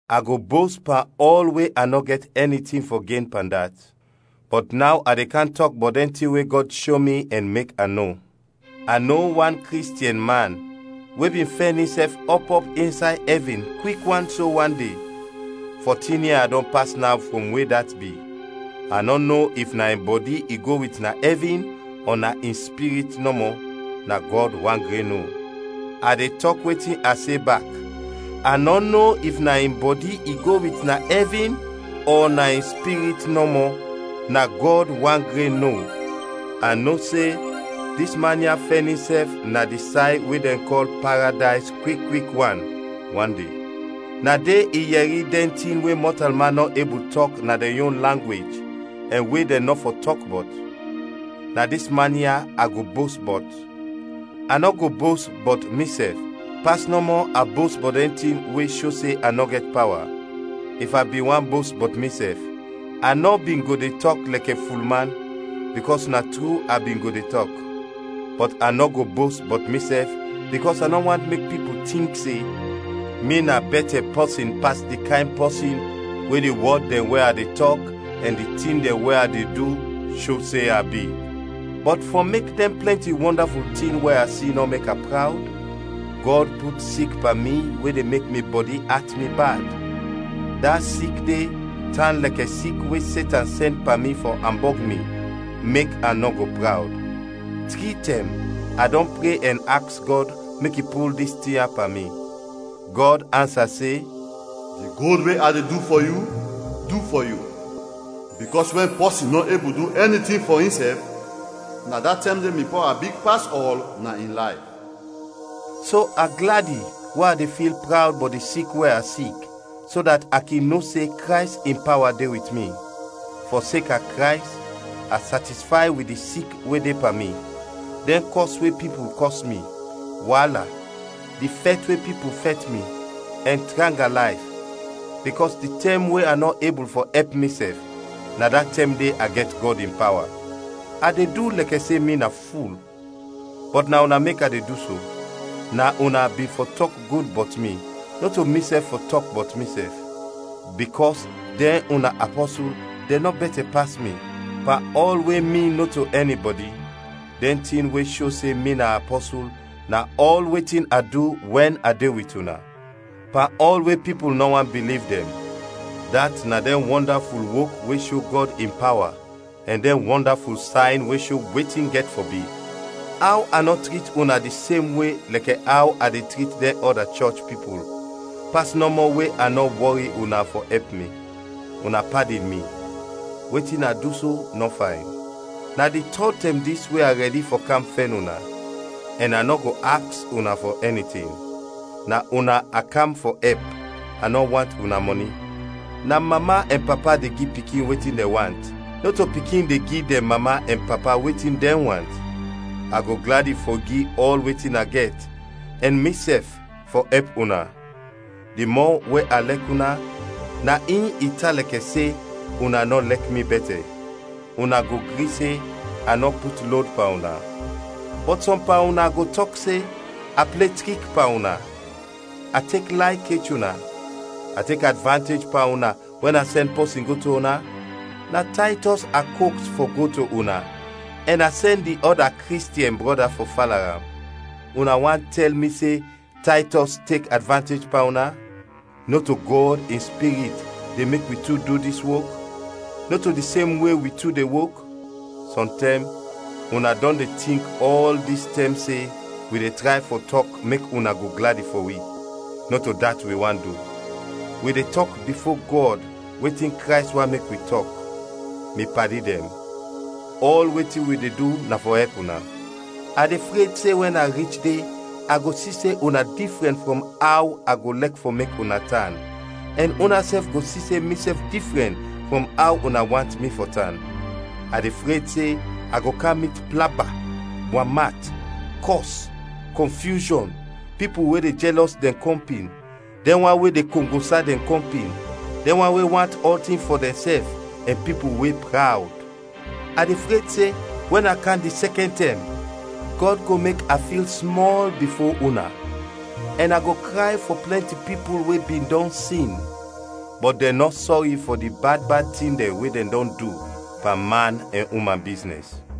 A go bost pan ɔl we a nɔ gɛt ɛni tin fɔ gen pan dat. Bɔt naw a de kam tɔk bɔt dɛn tin we Gɔd sho mi ɛn mek a no. A no wan Kristiɛn man we bin fɛn insɛf ɔp ɔp insay ɛvin kwik wan so wan de, fotin ia dɔn pas naw frɔm we dat bi (a nɔ no if na in bɔdi i go wit na ɛvin ɔ na in spirit nɔmɔ; na Gɔd wan gren no). A de tɔk wetin a se bak (a nɔ no if na in bɔdi i go wit na ɛvin ɔ na in spirit nɔmɔ; na Gɔd wan gren no). A no se dis man ya fɛn insɛf na di say we dɛn kɔl Paredays kwik kwik wan, wan de. Na de i yɛri dɛn tin we mɔtalman nɔ ebul tɔk na dɛn yon langwej ɛn we dɛn nɔ fɔ tɔk bɔt. Na dis man ya a go bost bɔt, a nɔ go bost bɔt misɛf, pas nɔmɔ a bost bɔt dɛn tin we sho se a nɔ gɛt pawa. If a bin want bost bɔt misɛf, a nɔ bin go de tɔk lɛkɛ fulman, bikɔs na tru a bin go de tɔk. Bɔt a nɔ go bost bɔt misɛf bikɔs a nɔ want mek pipul tink se mi na bɛtɛ pɔsin pas di kayn pɔsin we di wɔd dɛn we a de tɔk ɛn di tin dɛn we a de du, sho se a bi. Bɔt fɔ mek dɛn plɛnti wɔndaful tin we a si nɔ mek a prawd, Gɔd put sik pan mi we de mek mi bɔdi at mi bad; da sik de tan lɛkɛ sik we Setan sɛn pan mi fɔ ambɔg mi, mek a nɔ go prawd. Tri tɛm a dɔn pre ɛn aks Gɔd mek i pul dis tin ya pan mi. Gɔd ansa se, “Di gud we a de du fɔ yu, du fɔ yu, bikɔs wɛn pɔsin nɔ ebul du ɛni tin fɔ insɛf, na da tɛm de mi pawa big pas ɔl na in layf.” So a gladi we a de fil prawd bɔt di sik we a sik, so dat a kin no se Krays in pawa de wit mi. Fɔseka Krays, a satisfay wit di sik we de pan mi, dɛn kɔs we pipul kɔs mi, waala, di fɛt we pipul fɛt mi, ɛn tranga layf, bikɔs di tɛm we a nɔ ebul fɔ ɛp misɛf, na da tɛm de a gɛt Gɔd in pawa. A de du lɛkɛ se mi na ful; bɔt na una mek a de du so. Na una bin fɔ tɔk gud bɔt mi, nɔto misɛf fɔ tɔk bɔt misɛf. Bikɔs dɛn una “apɔsul” dɛn nɔ bɛtɛ pas mi, pan ɔl we mi nɔto ɛnibɔdi. Dɛn tin we sho se mi na apɔsul na ɔl wetin a du wɛn a de wit una, pan ɔl we pipul nɔ want biliv dɛn; dat na dɛn wɔndaful wok we sho Gɔd in pawa ɛn dɛn wɔndaful sayn we sho wetin gɛt fɔ bi. Aw a nɔ trit una di sem we lɛkɛ aw a de trit dɛn ɔda chɔch pipul, pas nɔmɔ we a nɔ wɔri una fɔ ɛp mi? Una padin mi, wetin a du so nɔ fayn. Na di tɔd tɛm dis we a rɛdi fɔ kam fɛn una, ɛn a nɔ go aks una fɔ ɛni tin. Na una a kam fɔ ɛp, a nɔ want una mɔni. Na mama ɛn papa de gi pikin wetin dɛn want, nɔto pikin de gi dɛn mama ɛn papa wetin dɛn want. A go gladi fɔ gi ɔl wetin a gɛt, ɛn misɛf, fɔ ɛp una. Di mɔ we a lɛk una, na in i tan lɛkɛ se una nɔ lɛk mi bɛtɛ. Una go gri se a nɔ put lod pan una. Bɔt sɔm pan una go tɔk se, a ple trik pan una, a tek lay kech una. A tek advantej pan una wɛn a sɛn pɔsin go to una? Na Taytɔs a koks fɔ go to una ɛn a sɛn di ɔda Kristiɛn brɔda fɔ fala am. Una want tɛl mi se Taytɔs tek advantej pan una? Nɔto Gɔd in Spirit de mek wi tu du dis wok? Nɔto di sem we wi tu de wok? Sɔntɛm una dɔn de tink ɔl dis tɛm se wi de tray fɔ tɔk mek una go gladi fɔ wi. Nɔto dat wi want du, wi de tɔk bifo Gɔd wetin Krays want mek wi tɔk. Mi padi dɛn, ɔl wetin wi de du na fɔ ɛp una. A de fred se wɛn a rich de a go si se una difrɛn frɔm aw a go lɛk fɔ mek una tan ɛn unasɛf go si se misɛf difrɛn frɔm aw una want mi fɔ tan. A de fred se a go kam mit plaba, wam at, kɔs, kɔnfyushɔn, pipul we de jɛlɔs dɛn kɔmpin, dɛn wan we de kongosa dɛn kɔmpin, dɛn wan we want ɔltin fɔ dɛnsɛf, ɛn pipul we prawd. A de fred se wɛn a kam di sɛkɛn tɛm, Gɔd go mek a fil smɔl bifo una, ɛn a go kray fɔ plɛnti pipul we bin dɔn sin, bɔt dɛn nɔ sɔri fɔ di bad bad tin dɛn we dɛn dɔn du pan man ɛn uman biznɛs.